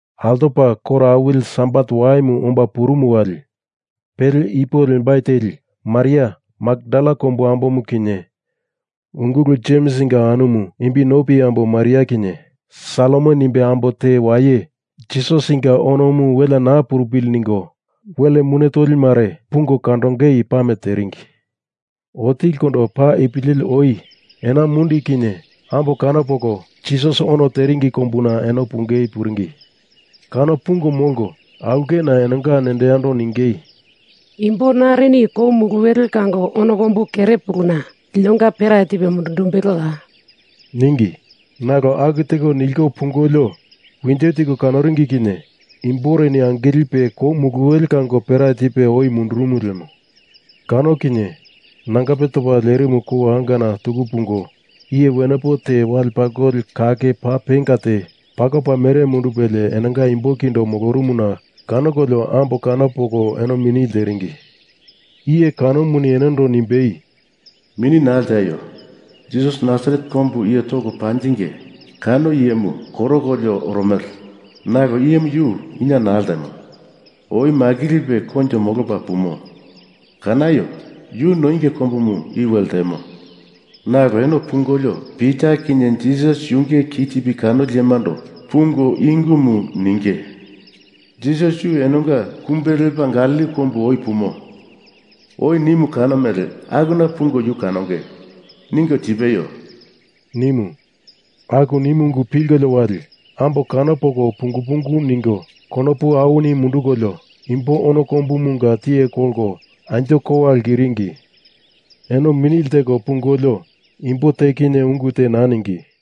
Altopa koro awili Sabat waimu omba purumu wali pele ipo lembai teli Maria Makdala kombu ambomu kinye ungulu Jemsinga anumu imbi nopi ambo Maria kinye Salome nimbe ambo te waye Jisasinga onomu welea naa purupili ningo wel mune tolimare pungo kandongei pame teringi. Otilikondo paa ipu leli oi ena mundi kinye ambo kano poko Jisas ono teringi kombuna eno pungei puringi. Kano pungo molko aulkena enonga nendo yando ningei, “Imbo narini kou muluwele kango ono kombu kerepuluna linonga pera tipe mundundumbeloya?” ningi. Nalo aku teko niliko pungolio winjo tiko kanoringi kinye imboreni angilipe kou muluwele kango pera tipe oi mundurumu lemo. Kano kinye nangape topa lerimu kou angana tuku pungo iye wenepo te wale pakoli kake paa penga te pakopa mere mundupelie enonga imbo kindo molorumuna kanokolio ambo kano poko eno mini lteringi. Iye kanomuni enondo nimbei, “Mini naa lteaio. Jisas Nasaret kombu iye toko panjinge kano iyemu koroliko oromele, nalo iyemu yu ina naa ltemo. Oi makilipe koinjo molopa pumo. Kanaio! Yu noinge kombumu i we ltemo. Nalo eno pungolio Pita kinye Jisas yunge kitipi kanoli iyemando pungo i ungumu ningei, ‘Jisas yu enonga kumbe lepa Galili kombu oi pumo. Oi nimu kano mele akuna pungo yu kanonge,’ ningo tipeio,” nimu. Aku nimu ungu pilkolio wali ambo kano poko pungu pungu ningo konopu awini mundukolio imbo ono kombumunga tiye kolko anjo kowa lkiringi. Eno mini lteko pungolio imbo te kinye ungu te naa ningi.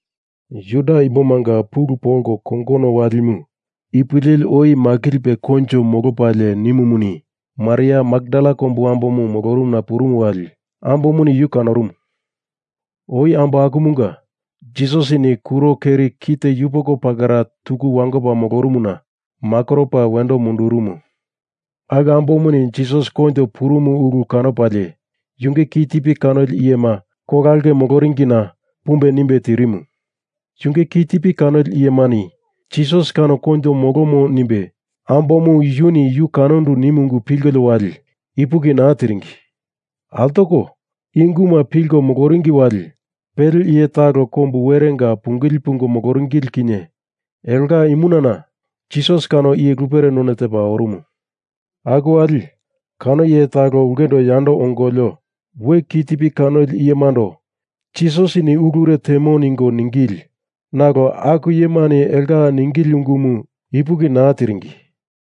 Juda imbomanga pulu polko kongono walimu ipu leli oi makilipe koinjo molopalie nimumuni Maria Makdala kombu ambo molorumuna purumu wali ambomuni yu kanorumu. Oi ambo akumunga Jisasini kuro keri kite yupoko pakera tuku wangoko moloringina makoropa wendo mundurumu. Aku ambomuni Jisas koinjo purumu ulu kanopalie yunge kitipi kanoli iyema kola aulke moloringina pumbe nimbe tirimu. Yunge kitipi kanoli iyemani Jisas kano koinjo molomo nimbe ambomu yuni yu kanandu nimu ungumu pilkolio wali ipuki naa tiringi. Altoko i unguma pilko moloringi wali pele iye talo kombu werenga pungili pungo moloringili kinye elonga imunana Jisas kano iye lupere none tepa orumu. Aku wali kano iye talo ulkendo yando ongolio we ki tipi kanoli iyemando Jisasini i ulure temo ningo ningili nalo aku iyemani elonga ningili ungumu ipuki naa tiringi.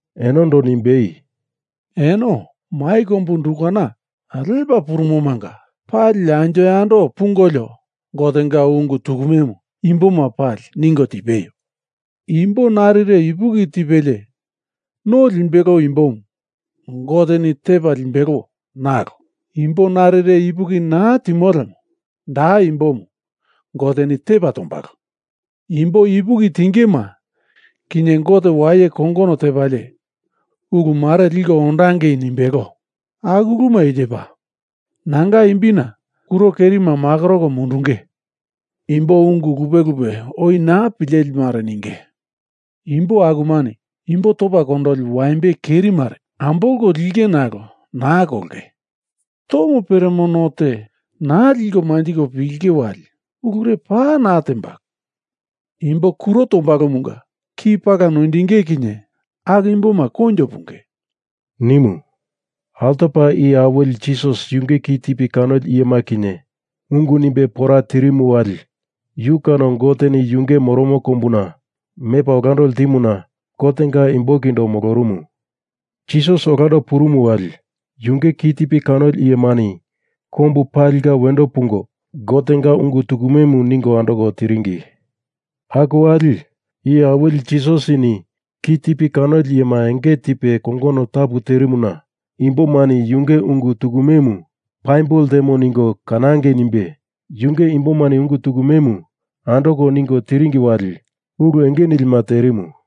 Enondo nimbei, “Eno mai kombu undukana lepa purumomunga pali anjo yando pungolio Gotenga ungu tukumemu imboma pali ningo tipeio. Imbo narire ipuki tipelie no limbelo imbomu Goteni tepa limbelo nalo imbo narire ipuki naa timo lemo da imbomu Goteni tepa tombalo. Imbo ipuki tingema kinye Gote waye kongono tepalie ulumare liko ondangei nimbelo. Aku uluma i tepa: Nanga imbina kuro kerima makoroko mundunge. Imbo ungu lupe lupe oi naa pilelimare ninge. Imbo akumani imbo topa kondoli waimbe keri mare ambolko linge nalo naa kolonge. Tomo peremo no te naa liko manjiko pilinge wali ulure paa naa tembalo. Imbo kuro tombalomunga ki pala noindinge kinye aku imboma koinjo punge,” nimu. Altopa Iye Awili Jisas yunge kitipi kanoli iyema kinye ungu nimbe pora tirimu wali yu kano Goteni yunge moromo kombuna mepa olando ltimuna Gotenga imbo kindo molorumu. Jisas olando purumu wali, yunge kitipi kanoli iyemani kombu palinga wendo pungo Gotenga ungu tukumemu ningo andoko tiringi. Aku wali Iye Awili Jisasini kitipi kanoli iyema enge tipe kongono tapu terimuna imbomani yunge ungu tukumemu paimbo ltemo ningo kanangei nimbe yunge imbomani ungu tukumemu andoko ningo tiringi wali ulu enge nilima terimu.